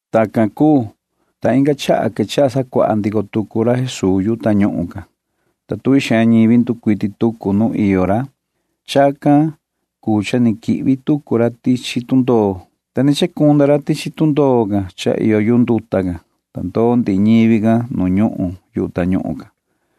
Tacan cuu, ta inga chaha quechaha sacuaha ndico tucu ra Jesuu yu tañuhun can, ta tuvi xaan ñivi nducuiti tucu nu iyo ra. Chacan cuu cha ni quihvi tucu ra tichi tundoo, ta ni chacunda ra tichi tundoo can cha iyo yu nduta can, ta ndoo ndihi ñivi can nu ñuhun yu tañuhun can.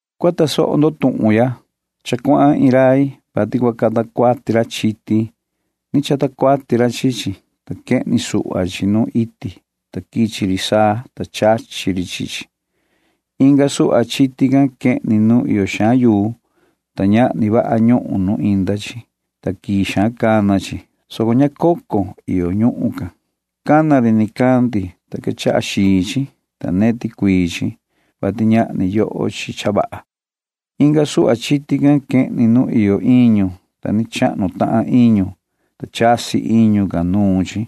―Cua tasoho ndo tuhun ya. Cha cuahan iin rai, vati cua cata cuati ra chiti. Ni chata cuati ra chi chi, ta quehni suhva chi nu iti, ta quichi ri saa, ta chachi ri chi chi. Inga suhva chiti can quehni nu iyo xaan yuu, ta ñahni vaha ñuhun nu inda chi, ta quii xaan cana chi, soco ña cocon iyo ñuhun can. Cana ri nicandi, ta quechaha xii chi, ta neti cuii chi, vati ñahni yoho chi cha vaha. Inga suhva chiti can quehni nu iyo iñu, ta ni chahnu tahan iñu, ta chasi iñu can nuun chi,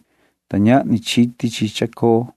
ta ñahni chiti chi chacoo.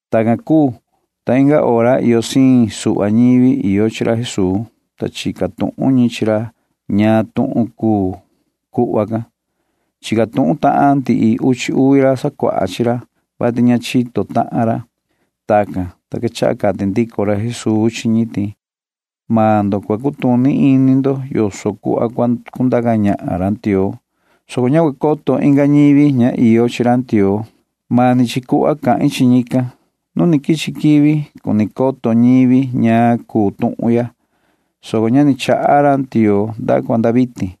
Tacan cuu, ta inga hora iyo siin suhva ñivi iyo chi ra Jesuu, ta chica tuhun ñi chi ra ñaan tuhun cuu cuhva can. Chica tuhun tahan ndihi uchi uvi ra sacuaha chi ra, [vati ña chito tahan ra]. Tacan, ta quechaha cati ndico ra Jesuu chi ñi ti: ―Maan ndo cua cutuni ini ndo yoso cuhva cua cundaca ñahan ra Ndioo, soco ña cua coto inga ñivi ña iyo chi ra Ndioo. Mani chi cuhva cahin chi ñican. Nu ni quichi quivi cuni coto ñivi ñaan cha cuu tuhun ya, soco ña ni chaha ra Ndioo nda cua nda vitin.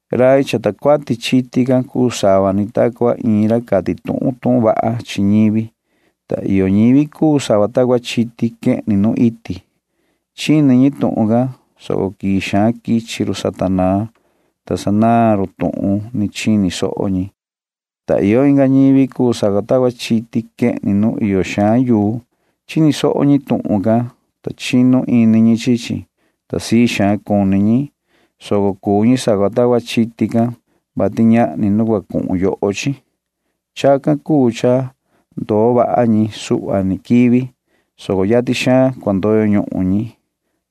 Rai chata cuati chiti can cuu sava ni ta cua iin ra cati tuhun tuhun vaha chi ñivi, ta iyo ñivi cuu sava ta cua chiti quehni nu iti. Chini ñi tuhun can, soco quii xaan quichi run Satanaa, ta sanaan run tuhun ni chini soho ñi, ta iyo inga ñivi cuu sava ta cua chiti quehni nu iyo xaan yuu. Chini soho ñi tuhun can, ta chinu ini ñi chi chi, ta sii xaan cuni ñi, soco cuu ñi sava ta cua chiti can, vati ñahni nu cua cuhun yoho chi. Chacan cuu cha ndoo vaha ñi suhva ni quivi, soco yatin xaan cua ndoyo ñuhun ñi,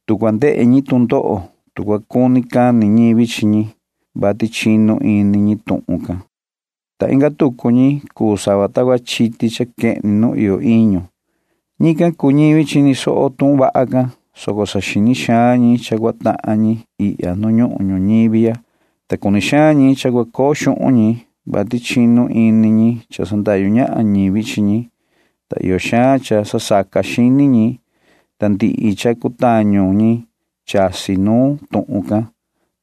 tu cua ndehe ñi tu ndoho, tu cua cuni cani ñivi chi ñi, vati chinu ini ñi tuhun can, ta inga tucu ñivi cuu sava ta cua chiti cha quehni nu iyo iñu. Ñican cuu ñivi chini soho tuhun vaha can, soco saxini xaan ñi cha cua tahan ñi ihya nu ñuhun ñuñivi ya, ta cuni xaan ñi cha cua coo xuhun ñi, vati chinu ini ñi cha sandahyu ñahan ñivi chi ñi, ta iyo xaan cha sasaca xini ñi, ta ndihi cha cutañu ñi chasi nuun tuhun can,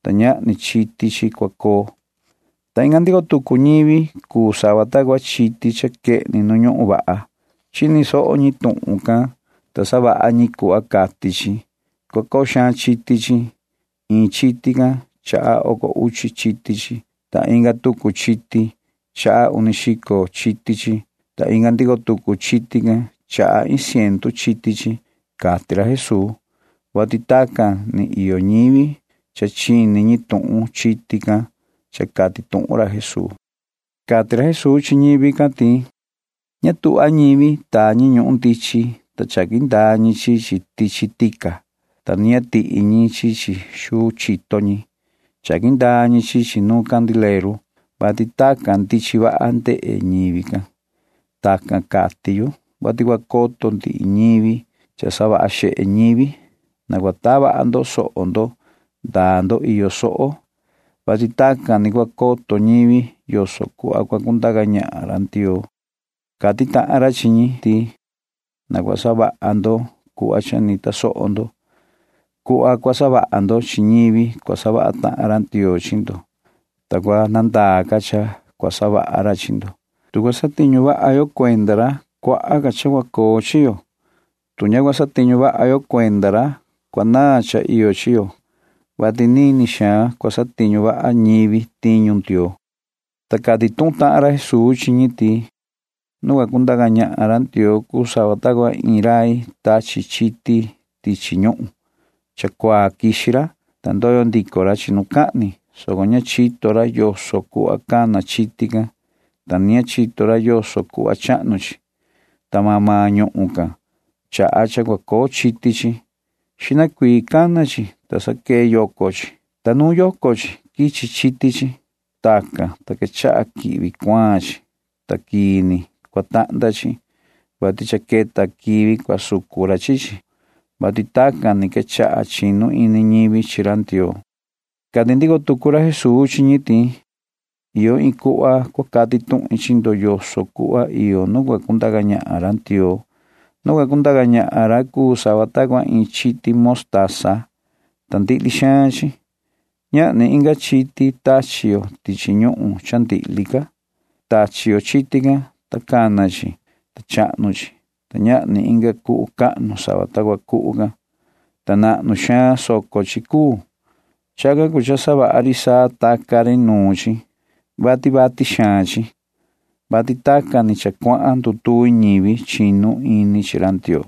ta ñahni chiti chi cua coo, ta inga ndico tucu ñivi cuu sava ta cua chiti cha quehni nu ñuhun vaha. Chini soho ñi tuhun can, ta savaha ñi cuhva cati chi. Cua coo xaan chiti chi. Iin chiti can chaha oco uchi chiti chi, ta inga tucu chiti chaha uni xico chiti chi, ta inga ndico tucu chiti can chaha iin ciendu chiti chi ―cati ra Jesuu, [vati tacan ni iyo ñivi cha chini ñi tuhun chiti can cha cati tuhun ra Jesuu]. Cati ra Jesuu chi ñivi can ti: ―Ña tuhva ñivi taa ñi ñuhun ndichin, ta chaqui ndaa ñi chi chi tichi tica, ta ni ña tihi ñi chi chi xuu chito ñi. Chaqui ndaa ñi chi chi nu candileru, [vati tacan ndichin vaha ndehe ndihi ñivi can]. [Tacan cati yu,] vati cua coto ndihi ñivi ndihi cha savaha xehe ñivi. Na cua taa vaha ndo soho ndo ndaa ndo iyo soho ―cati ra, [vati tacan ni cua coto ñivi yoso cuhva cua cundaca ñahan ra Ndioo]. Cati tahan ra chi ñi ti: ―Na cua savaha ndo cuhva cha ni tasoho ndo. Cuhva cua savaha ndo chi ñivi cua savaha tahan ra Ndioo chi ndo, ta cua nandaa ca cha cua savaha ra chi ndo. Tu cua satiñu vaha yo cuenda ra, vii ca cua coo ca chi yo. Tu ña cua satiñu vaha yo cuenda ra, cua naan cha iyo chi yo ―cati ra, [vati nini xaan cua satiñu vaha ñivi tiñu Ndioo]. Ta cati tuhun tahan ra Jesuu chi ñi ti: ―Nu cua cundaca ñahan ra Ndioo cuu sava ta cua iin rai tachi chiti tichi ñuhun. Cha cuaa quixi ra, ta ndoyo ndico ra chinucahni, soco ña chito ra yoso cuhva cana chiti can, ta ni ña chito ra yoso cuhva chahnu chi, ta maan maan ñuhun can chaha cha cua coo chiti chi. Xihna cuii cana chi, ta sa quee yoco chi, ta nuun yoco chi quichi chiti chi. Tacan, ta quechaha quihvi cuaan chi, ta quii ni cua tahnda chi, vati cha queta quivi cua sucu ra chi chi ―cati ra Jesuu, [vati tacan ni quechaha chinu ini ñivi chi ra Ndioo]. Cati ndico tucu ra Jesuu chi ñi ti: ―Iyo iin cuhva cua cati tuhin chi ndo yoso cuhva iyo nu cua cundaca ñahan ra Ndioo. Nu cua cundaca ñahan ra cuu sava ta cua iin chiti motasa, ta ndihli xaan chi. Ñahni inga chiti tachi yo tichi ñuhun cha ndihli ca. Tachi yo chiti can, ta cana chi, ta chahnu chi, ta ñahni inga cuhu cahnu sava ta cua cuhu can, ta nahnu xaan soco chi cuu. Chacan cuu cha savaha ri saa taca ri nuun chi, vati vati xaan chi ―cati ra, [vati tacan ni cha cuahan ndutuvi ñivi chinu ini chi ra Ndioo].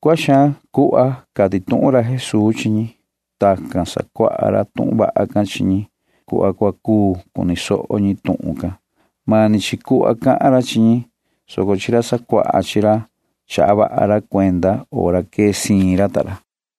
Cuaha xaan cuhva can cati tuhun ra Jesuu chi ñi. Tacan sacuaha ra tuhun vaha can chi ñi cuhva cua cuu cuni soho ñi tuhun can. Mani chi cuhva cahan ra chi ñi, soco chi ra sacuaha chi ra chaha vaha ra cuenda hora quee siin ra ta ra.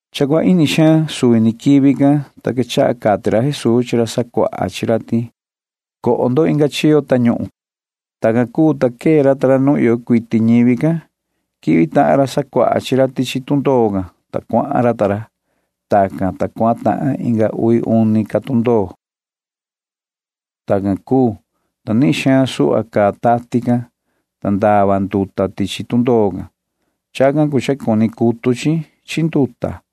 Cha cua ini xaan suvi ni quivi can, ta quechaha cati ra Jesuu chi ra sacuaha chi ra ti: ―Na coho inga chiyo tañuhun ya ―cati ra. Tacan cuu, ta quee ra ta ra nu iyo cuiti ñivi can. Quihvi tahan ra sacuaha chi ra tichi tundoo can, ta cuahan ra ta ra. Tacan, ta cuahan tahan inga uvi uni ca tundoo. Tacan cuu, ta nihin xaan suhva caa tati can, ta ndava nduta tichi tundoo can. Chacan cuu cha cuni cutu chi chi nduta.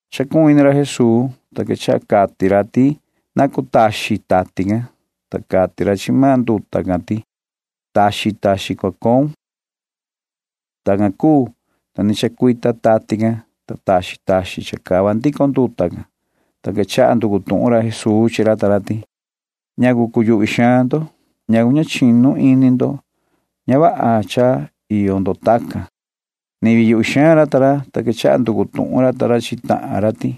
Chacuhun ini ra Jesuu, ta quechaha cati ra ti na cutaxin tati can, ta cati ra chi maan nduta can ti: ―Taxin taxin cua coun ―cati ra. Tacan cuu, ta ni chacuita tati can, ta taxin taxin chacava ndico nduta can, ta quechaha nducu tuhun ra Jesuu chi ra ta ra ti: ―¿Ñacu cuyuhvi xaan ndo? ¿Ñacu ña chinu ini ndo? [Ña vaha cha iyo ndo tacan] ―cati ra. Ni vii yuhvi xaan ra ta ra, ta quechaha nducu tuhun ra ta ra chi tahan ra ti: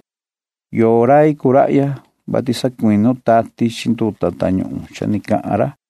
―¿Yoo rai cuu rahya, vati sacuinu tati chi nduta tañuhun ya cha ni cahan ra? ―cati ra ta ra.